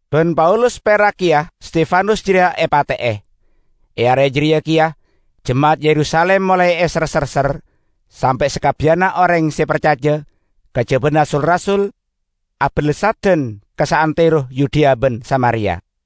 Ban Saulus perak keya Stefanus jareya epate'e. E are jareya keya jema'at e Yerusalim molae eser-serser, sampe' sakabbiyanna oreng se parcaja, kajabana sul-rasul, abalessadan ka saantero Yudea ban Samaria.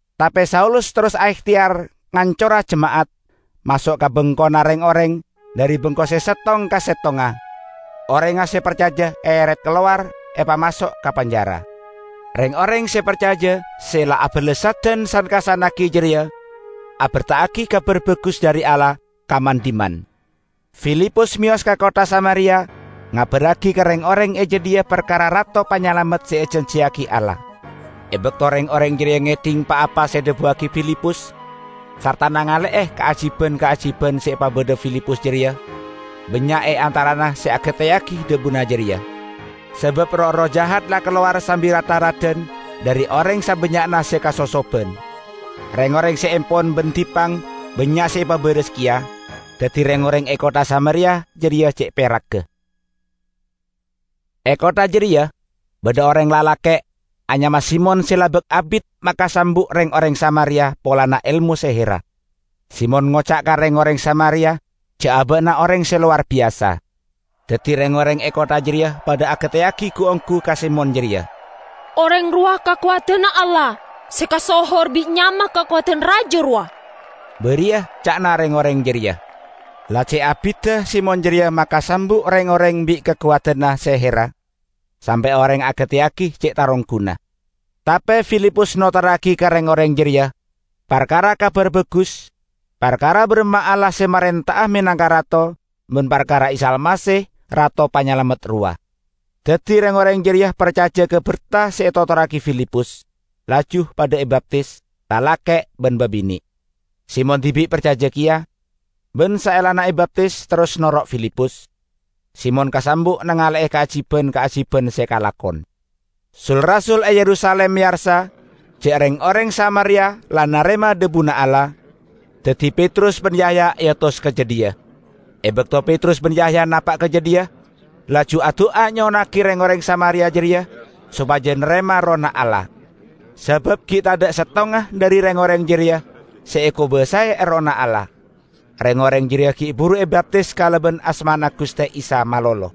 Tape Saulus terros aehteyar ngancora jema'at; maso' ka bengkona reng-oreng, dhari bengko se settong ka settongnga, orengnga se parcaja eeret kalowar, epamaso' ka penjara. Reng-oreng se parcaja se la abalessadan san-kassannagi jareya aberta'agi Kabar Bagus dhari Allah ka man-dhimman. Filipus meyos ka kottha Samaria ngabarragi ka reng-oreng e jadhiya parkara Rato Panyalamet se ejanjiyagi Allah. E bakto reng-oreng jareya ngedhing pa-apa se edhabuwagi Filipus sarta nangale'e kaajiban-kaajiban se epabadha Filipus jareya, bannya' e antarana se agateyagi dhabuna jareya. Sabab roh-erroh jahat la kalowar sambi rat-tharadan dhari oreng sabannya'na se kasosoban. Reng-oreng se empon ban dippang bannya' se epabaras keya. Daddi reng-oreng e kottha Samaria jareya ce' peragga. E kottha jareya badha oreng lalake' anyama Simon se la abak abit makasambu' reng-oreng Samaria polana elmo seherra. Simon ngoca' ka reng-oreng Samaria ja' aba'na oreng se lowar biyasa. Daddi reng-oreng e kottha jareya padha agateyagi gu-onggu ka Simon jareya. "Oreng rowa kakowadanna Allah se kasohor bi' nyama 'Kakowadan Raja' rowa," bariya ca'na reng-oreng jareya. La ce' abidda Simon jareya makasambu' reng-oreng bi' kakowadanna seherra, sampe' oreng agateyagi ce' tarongguna. Tape Filipus notorragi ka reng-oreng jareya parkara Kabar Bagus parkara baramma Allah se marenta'a menangka Rato, ban parkara Isa Almasih, Rato Panyalamet rowa. Daddi reng-oreng jareya parcaja ka berta se etotorragi Filipus, laju padha ebaptis, lalake' ban babine'. Simon dibi' parcaja keya. Ban saellana ebaptis, terros noro' Filipus. Simon kasambu' nangale'e kaajiban-kaajiban se kalakon. Sul-rasul e Yerusalim meyarsa ja' reng-oreng Samaria la narema dhabuna Allah. Daddi Petrus ban Yahya eotos ka jadhiya. E bakto Petrus ban Yahya napa' ka jadhiya, laju adu'a nyo'onnagi reng-oreng Samaria jareya sopaja narema Errohna Allah, sabab gi' tadha' settonga dhari reng-oreng jareya se ekobasae Errohna Allah; reng-oreng jareya gi' buru ebaptis kalaban asmana Guste Isa malolo.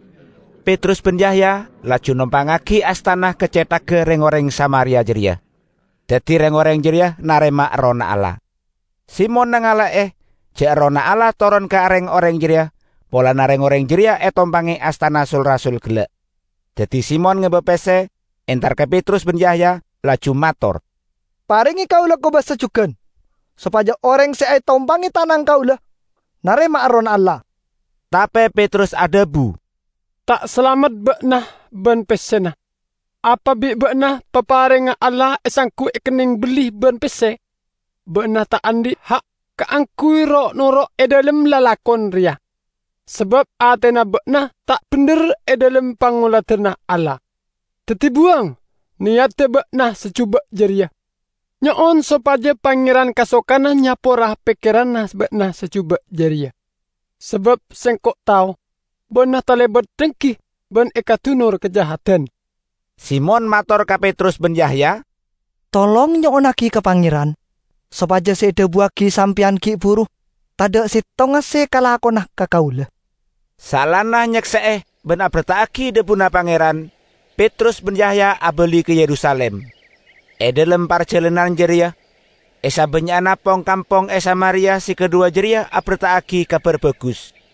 Petrus ban Yahya laju nompangngagi astana ka cethagga reng-oreng Samaria jareya; daddi reng-oreng jareya narema Errohna Allah. Simon nangale'e ja' Errohna Allah toron ka reng-oreng jareya polana reng-oreng jareya etompange astana sul-rasul gella'. Daddi Simon ngeba pesse entar ka Petrus ban Yahya, laju mator, "Parenge kaula kobasa jugan, sopaja oreng se etompange tanang kaula narema Errohna Allah." Tape Petrus adhabu, "Ta' salamet ba'na ban pessena! Apa bi' ba'na paparengnga Allah esanggu ekenneng belli ban pesse? Ba'na ta' andhi' ha' kaangguy ro'-noro' e dhalem lalakon reya, sabab atena ba'na ta' bendher e dhalem pangoladanna Allah. Daddi buwang neyadda ba'na se juba' jareya, nyo'on sopaja Pangeran kasokana nyapora pekkeranna ba'na se juba' jareya! Sabab sengko' tao ba'na talebat denggi ban ekadunor kajahadan." Simon mator ka Petrus ban Yahya, "Tolong, nyo'onnagi ka Pangeran sopaja se edhabuwagi sampeyan gi' buru tadha' settonga se kalakona ka kaula." Saellana nyakse'e ban aberta'agi dhabuna Pangeran, Petrus ban Yahya abali ka Yerusalim. E dhalem parjalanan jareya, e sabannya'na pong-kampong e Samaria se kadhuwa jareya aberta'agi Kabar Bagus.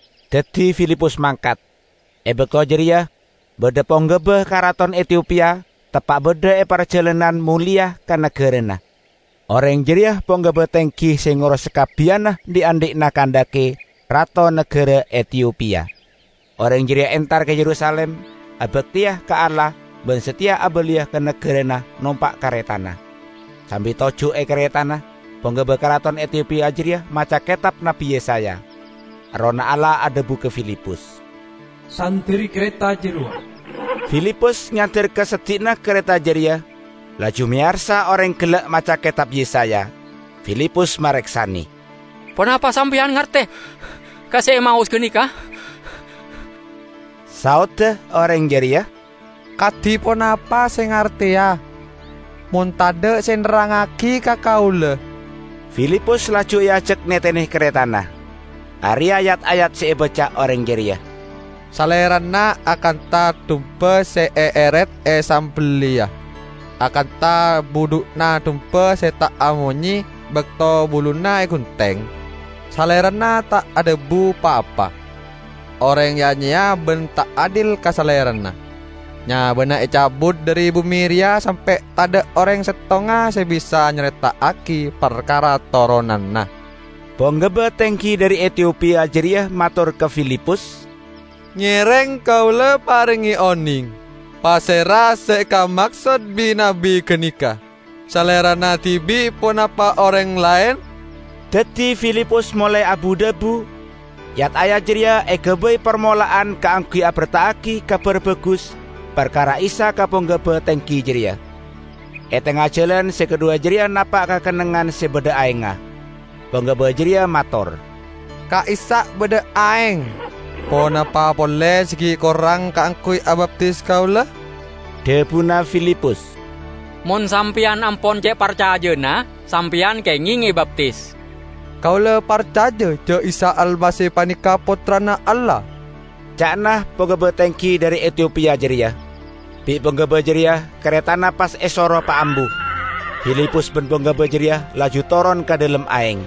Daddi Filipus mangkat. E bakto jareya badha ponggaba karaton Etiopia teppa' badha e parjalanan moleya ka nagarana. Oreng jareya ponggaba tenggi se ngoros sakabbiyanna dhi'-andhi'na Kandake, rato nagara Etiopia. Oreng jareya entar ka Yerusalim abakteya ka Allah ban sateya abaliya ka nagarana nompa' karetana. Sambi toju' e karetana, ponggaba karaton Etiopia jareya maca Ketab Nabbi Yesaya. Errohna Allah adhabu ka Filipus, "Sanderri kareta jarowa." Filipus nyander ka seddi'na kareta jareya, laju meyarsa oreng gella' maca Ketab Yesaya. Filipus mareksane, "Ponapa sampeyan ngarte ka se emaos ganeka?" Saodda oreng jareya, "Kadi ponapa se ngarteya mon tadha' se nerrangngagi ka kaula." Filipus laju eajak netene karetana. Areya' yat-ayat se ebaca oreng jareya, "Salerana akantha dumba se eeret esambelliya, akantha budhu'na dumba se ta' amonye bakto buluna egunteng, Salerana ta' adhabu pa-apa. Oreng ya-nyeya ban ta' adil ka Salerana. Nyabana ecabut dhari bume reya sampe' tadha' oreng settonga se bisa nyareta'agi parkara toronanna." Ponggaba tenggi dhari Etiopia jareya mator ka Filipus, "Ngereng kaula parenge oneng, pasera se ekamaksod bi' nabbi ganeka? Salerana dibi' ponapa oreng laen?" Daddi Filipus molae abu-dhabu; yat-ayat jareya egabay parmola'an kaangguy aberta'agi Kabar Bagus parkara Isa ka ponggaba tenggi jareya. E tengnga jalan se kadhuwa jareya napa' ka kennengngan se badha aengnga. Ponggaba jareya mator, "Ka'issa' badha aeng! Ponapa pole se gi' korang kaangguy abaptis kaula?" [ Dhabuna Filipus, "Mon sampeyan ampon ce' parcajana, sampeyan kengeng ebaptis." "Kaula parcaja ja' Isa Almasih paneka Pottrana Allah," ca'na ponggaba tenggi dhari Etiopia jareya.] Bi' ponggaba jareya karetana pas esoro paambu, Filipus ban ponggaba jareya laju toron ka dhalem aeng.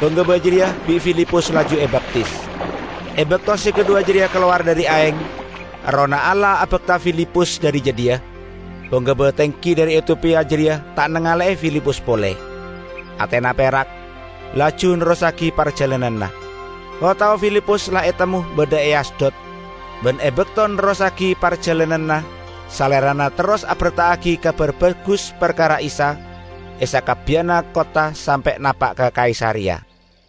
Ponggaba jareya bi' Filipus laju ebaptis. E bakto se kadhuwa jareya kalowar dhari aeng, Errohna Allah abakta Filipus dhari jadhiya. Ponggaba tenggi dhari Etiopia jareya ta' nangale'e Filipus pole. Atena perak, laju nerrossagi parjalananna. O-tao Filipus la etemmo badha e Asdod. Ban e bakto nerrossagi parjalananna salerana terros aberta'agi Kabar Bagus parkara Isa e sakabbiyanna kottha sampe' napa' ka Kaisareya.